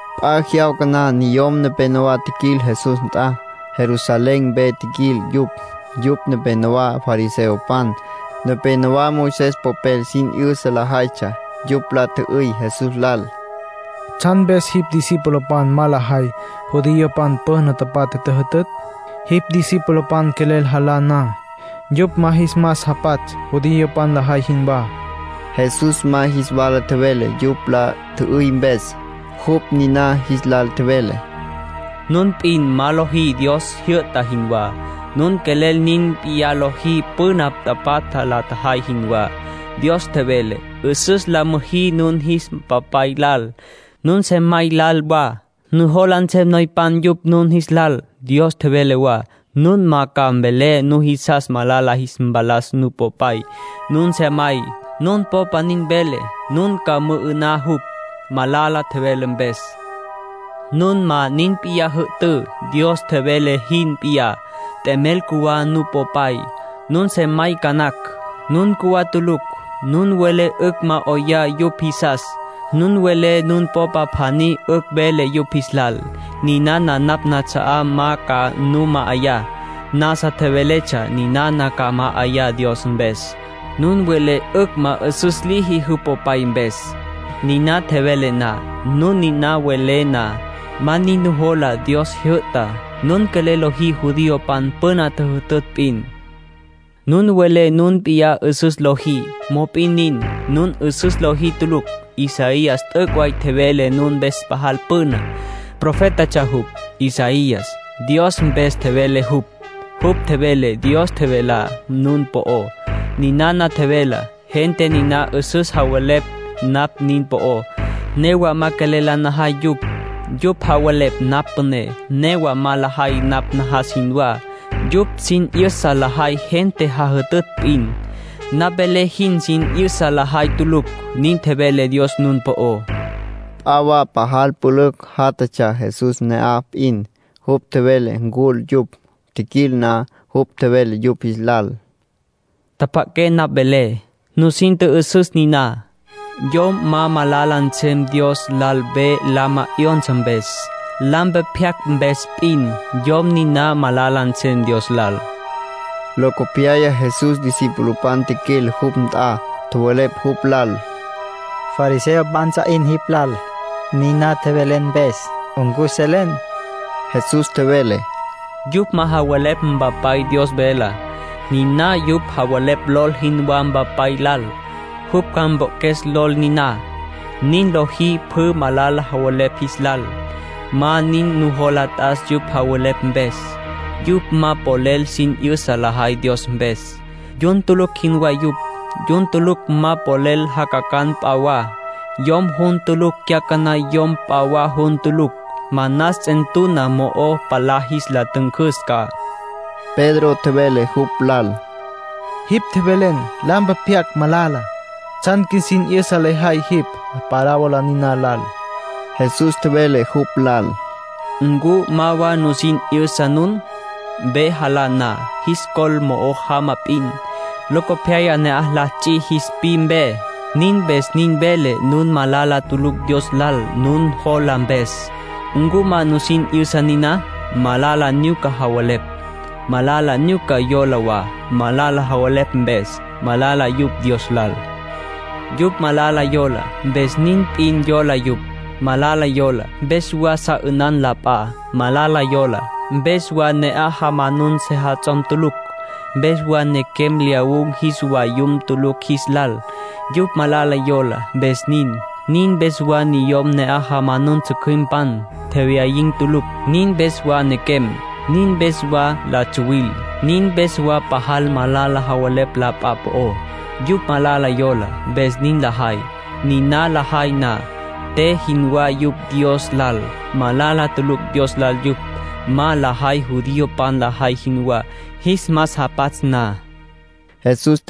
P'a jyawca na niyom nepénowa tjiquil Jesús nt'a. Jerusalén mpe tjiquil yupj. Yupj nepénowa fariseopan, nepénowa Moisés popel sin 'yüsa lajaytsja. Yupj la tjü'üy Jesús lal: —¿Tsjan mpes jipj discipulopan ma lajay judiopan püna tapatja tjüjütütj? Jipj discipulopan quelel jalá na, yupj ma jis mas japatsj judiopan lajay jinwá. Jesús ma jis wala tjevele yupj la tjü'üy mpes. Jupj niná jis lal tjevele: —Nun p'in ma lojí Dios jyü'ta jinwá. Nun quelel nin p'iyá lojí püna tapatja la tjajay jinwá. Dios tjevele: ‘'Üsüs la müjí nun jis papay lal, nun sejamay lal wa. Nujola nsem noypan yupj nun jis lal.’ Dios tjevele wa: ‘Nun ma ca mvelé nujisas malala jis mpalas nupopay, nun sejamay. Nun popa nin vele, nun ca mü'ü'ná jupj, malala tjevele mpes.’ Nun ma nin p'iyá jü'tǘ, Dios tjevele jin p'iyá. T'emel cjuwá nupopay, nun sejamay ca nacj. Nun cjuwá tulucj. Nun welé 'ücj ma 'oyá yupj jisas. Nun welé nun popa pjaní 'ücj vele yupj jis lal: ‘Ninana napj nats'a'á ma ca nu ma'ayá. Nasa tjeveletsja ninana ca ma'ayá Dios mpes.’ Nun welé 'ücj ma 'üsüs liji jupj popay mpes, niná tjevele na. Nun niná welé na, ma nin nujola Dios tjijyü'tá. Nun quelel lojí judiopan püna tjüjütütj p'in. Nun welé nun p'iyá 'üsüs lojí; mop'in nin, nun 'üsüs lojí tulucj. Isaías t'üc' way tjevele nun mpes pajal püna. Profétatsja jupj, Isaías. Dios mpes tjevele jupj. Jupj tjevele Dios tjevelá nun po'ó. Ninana tjevelá: ‘Gente niná 'üsüs javelepj napj nin po'ó, Newa ma quelel la najay yupj. Yupj javelepj napj püné, newa ma lajay napj najas jinwá. Yupj sin 'yüsa lajay gente jajütütj p'in, napj velé jin sin 'yüsa lajay tulucj.’ Nin tjevele Dios nun po'ó —tjevele Jesús. P'a wa pajal pülücj játjatsja Jesús ne'aj p'in. Jupj tjevele ncul yupj. Tjiquil na, jupj tjevele yupj jis lal: —Tjapja'aqué napj velé. Nusin tjü'üsüs niná. Yom ma malala nsem Dios lal ve lama 'yonsa mpes. Lampe pyacj mpes p'in, yom niná malala nsem Dios lal —nin tjevele Jesús. Locopyaya Jesús discipulopan tjiquil jupj nt'a. Tjowelepj jupj lal: —Fariseopan ts'a 'in jipj lal, niná tjevelen mpes. ¿Ncu selen? Jesús tjevele: —Yupj ma javelepj Mpapay Dios velá. Niná yupj javelepj lol jinwá Mpapay lal. Jupj ca mpoqjues lol niná. Nin liji pjü malala javelepj jis lal. Ma nin nujola t'as yupj javelepj mpes. Yupj ma polel sin 'yüsa lajay Dios mpes. Yun tulucj jinwá yupj. Yun tulucj ma polel jacacan p'a wa. Yom jun tulucj cyacaná yom p'a wa jun tulucj, manas ts'entuna mo'o palá jis ntüncüs ca —nin tjevele Jesús. Pedro tjevele jupj lal: —Jipj tjevelen: lampe pyacj, malala. ¿Tsjan qjuisin 'yüsa lejay jipj parábola niná lal? Jesús tjevele jupj lal: —¿Ncu ma wa nusin 'yüsa nun? Ve jalá na, jis col mo'o jama p'in. Locopyaya na'aj la ts'i jis pwi mpe. Nin mpes nin velé nun malala tulucj Dios lal nun lojá mpes. ¿Ncu ma nusin 'yüsa niná? Malala nyuca javelepj, malala nyuca yola wa. Malala javelepj mpes, malala yupj Dios lal. Yupj malala yola, mpes nin p'in yola yupj. Malala yola, mpes wa sa 'ünan la p'a. Malala yola, mpes wa ne'aj jamanun sejats'om tulucj. Mpes wa nequem lyawun̈ jis vayum tulucj jis lal. Yupj malala yola, mpes nin. Nin mpes wa niyom ne'aj jamanun tsjücjüimpan, tjewyayin̈ tulucj. Nin mpes wa pequen̈. Nin mpes wa la tsuwil. Nin mpes wa pajal malala javelepj la p'a po'ó. Yupj malala yola, mpes nin lajay. Niná lajay na, te jinwá yupj Dios lal. Malala tulucj Dios lal yupj ma lajay judiopan lajay jinwá, jis mas japatsj na —nin tjevele Jesús.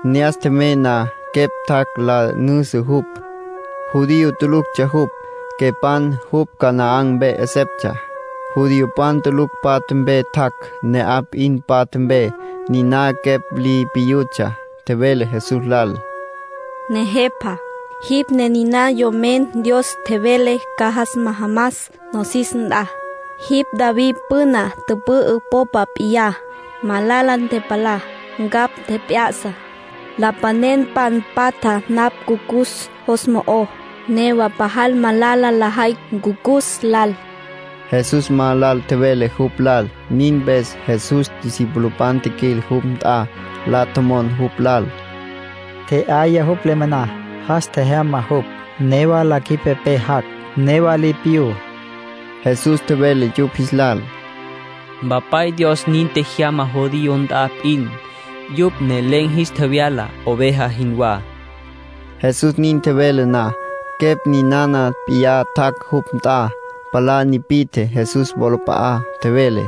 Ne'as tjemey na, quepj tjac' la nüjüsü jupj. Judío tuluctsja jupj, quepan. Jupj Canaán mpe 'eseptsja. Judiopan tulucj patja mpe tjac', ne'aj p'in patja mpe. Niná quepj li piyutsja, tjevele Jesús lal: —Nejepa, jipj ne niná Yomen Dios tjevele ca jas majamas nosis nt'a. Jipj David püna tüpü'ü popa p'iyá. Malala ntepalá. Ncapj tjep'ya'sa. Lapanenpan patja napj ncucus jos mo'ó. Newa pajal malala lajay ncucus lal —nin tjevele quepan. Jesús ma lal tjevele jupj lal. Nin mpes Jesús discipulopan tjiquil jupj nt'a, la tjomon jupj lal: —Tje'yaya jupj le moná. Jas tjejyama jupj. Newa la cjüipepé jac', newa li piyú. Jesús tjevele yupj jis lal: —Mpapay Dios nin tjejyama judiopan nt'a p'in. Yupj ne len̈ jis tjevyala, oveja jinwá. Jesús nin tjevele na, quepj ninana p'iyá tjac' jupj nt'a. Palá nipi'tje Jesús wolap'a'á. Tjevele: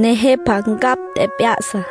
—Nejepa, ncapj tjep'ya'sa.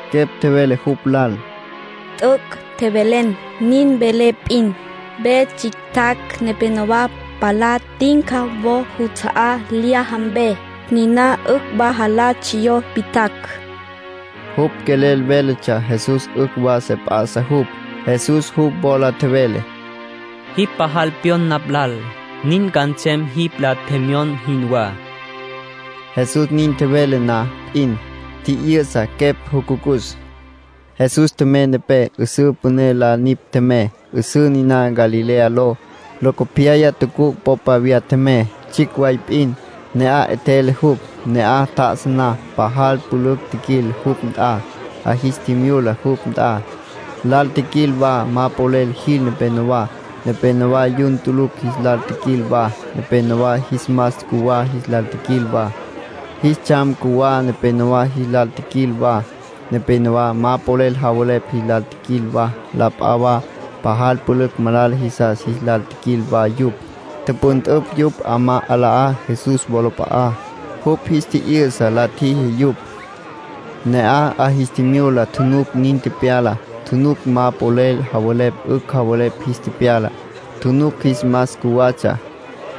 Quepj tjevele jupj lal: —T'üc' tjevelen. Nin velé p'in, ve tsjictjacj nepenowá palá tinca wo juts'a'á lyaja mpe. Niná 'ücj wa jalá tsjiyó witjacj —tjevele jupj. (Jupj quelel véletsja Jesús 'ücj wa se p'a'sa jupj.) Jesús jupj wola tjevele: —Jipj pajal pyon napj lal. Nin ca nsem jipj la tjemyon jinwá. Jesús nin tjevele na p'in, tji'yü'sa quepj jucucus. Jesús tjemey nepé. 'Üsǘ püné la nipj tjemey, 'üsǘ niná Galilea ló. Locopyaya tucuc' popa viyá tjemey, tsjicj way p'in. Ne'aj 'etjele jupj. Ne'aj tjá'asa na, pajal pülücj tjiquil jupj nt'a. 'A jis tjimyula jupj nt'a. Lal tjiquil wa ma polel jil nepenowá. Nepénowa yun tulucj jis lal tjiquil wa. Nepénowa jis mas cjuwá jis lal tjiquil wa. Jis tsjam cjuwá nepenowá jis lal tjiquil wa. Nepénowa ma polel javelepj jis lal tjiquil wa. La p'a wa pajal pülücj malala jisas jis lal tjiquil wa yupj. Tüpüntüpj yupj 'amá 'alá Jesús wolap'a'á; jupj jis tji'yü'sa la tjiji yupj. Ne'aj 'a jis tjimyula tjunuc nin tepyala. Tjunuc ma polel javelepj 'ücj javelepj jis tepyala. Tjunuc jis mas cjuwatsja,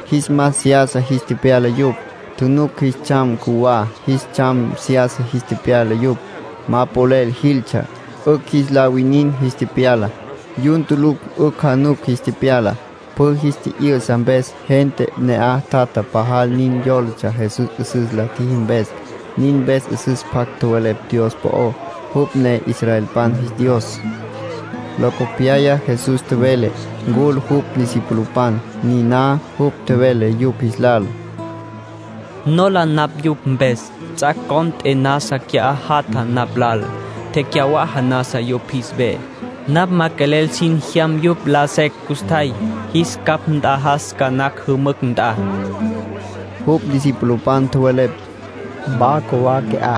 jis mas seyasa jis tepyala yupj. Tjunuc jis tsjam cjuwá, jis tsjam seyasa jis tepyala yupj. Ma polel jiltsja, 'ücj jis la winin jis tepyala. Yun tulucj 'ücj januc jis tepyala. Pjü jis tji'yü'sa mpes gente ne'aj tjatjá pajal nin yólatsja Jesús 'üsüs la tjiji mpes. Nin mpes 'üsüs pjac tjowelepj Dios po'ó, jupj ne israelpan jis Dios. Locopyaya Jesús tjevele ncul jupj discipulopan. Niná jupj tjevele yupj jis lal: —Nola napj yupj mpes. Ts'ac' cont'e nasa qui'á jatja napj lal. Tecyawaja nasa yupj jis ve. Napj ma quelel sin jyam yupj, laja secj custjay. Jis capj nt'ajas ca nacj jümücj nt'a. Jupj discipulopan tjowelepj: —Wa cjuwá qui'á.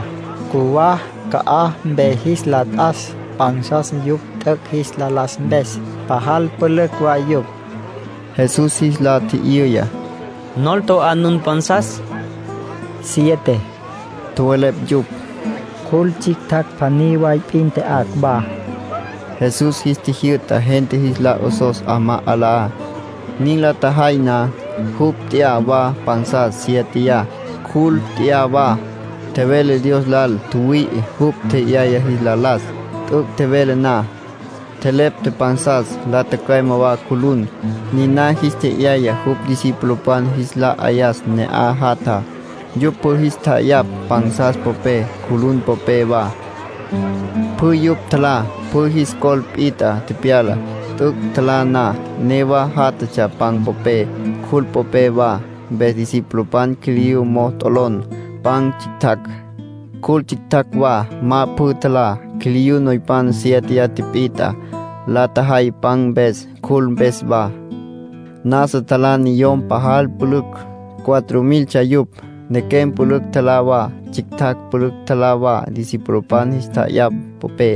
Cjuwá ca'aj mpe jis la t'as pansas yupj t'üc' jis la las mpes. Pajal pülücj way yupj. Jesús jis la tji'yüya: —¿Nol to'á nun pansas? —Siete —tjowelepj yupj—. Cjul tsjictjacj pjaní way p'in tya'acj wa. Jesús jis tjijyü'ta gente jis la 'osos 'amá 'alá. Nin la tjajay na, jupj nt'ya wa pansas sieteyá, cjul nt'ya wa. Tjevele Dios lal tjüwüi'i jupj tje'yaya jis la las. T'üc' tjevele na, tjelepta pansas, la tücüeme wa cjulun. Niná jis tje'yaya jupj discipulopan jis la 'ayas ne'aj jatjá. Yupj pjü jis tja'ayapj pansas popé, cjulun popé wa. Pjü yupj tjalá. Pjü jis col pit'a tepyala. T'üc' tjalá na, newa játjatsja pan popé, cjul popé wa. Mpes discipulopan quiliyú mo'o t'olon pan tsjictjacj, cjul tsjictjacj wa, ma pjü tjalá. Quiliyú noypan siéteya tipit'a la tjajay pan mpes, cjul mpes wa. Nasa tjalá niyom pajal pülücj. Cuatro miltsja yupj. Nequem pülücj tjalá wa. Tsjictjacj pülücj tjalá wa discipulopan jis tja'ayapj popé.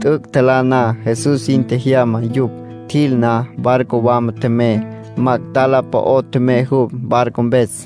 T'üc' tjalá na, Jesús sin tjejyama yupj. Tjil na, barco wama tjemey. Magdalá po'o tjemey jupj, barco mpes.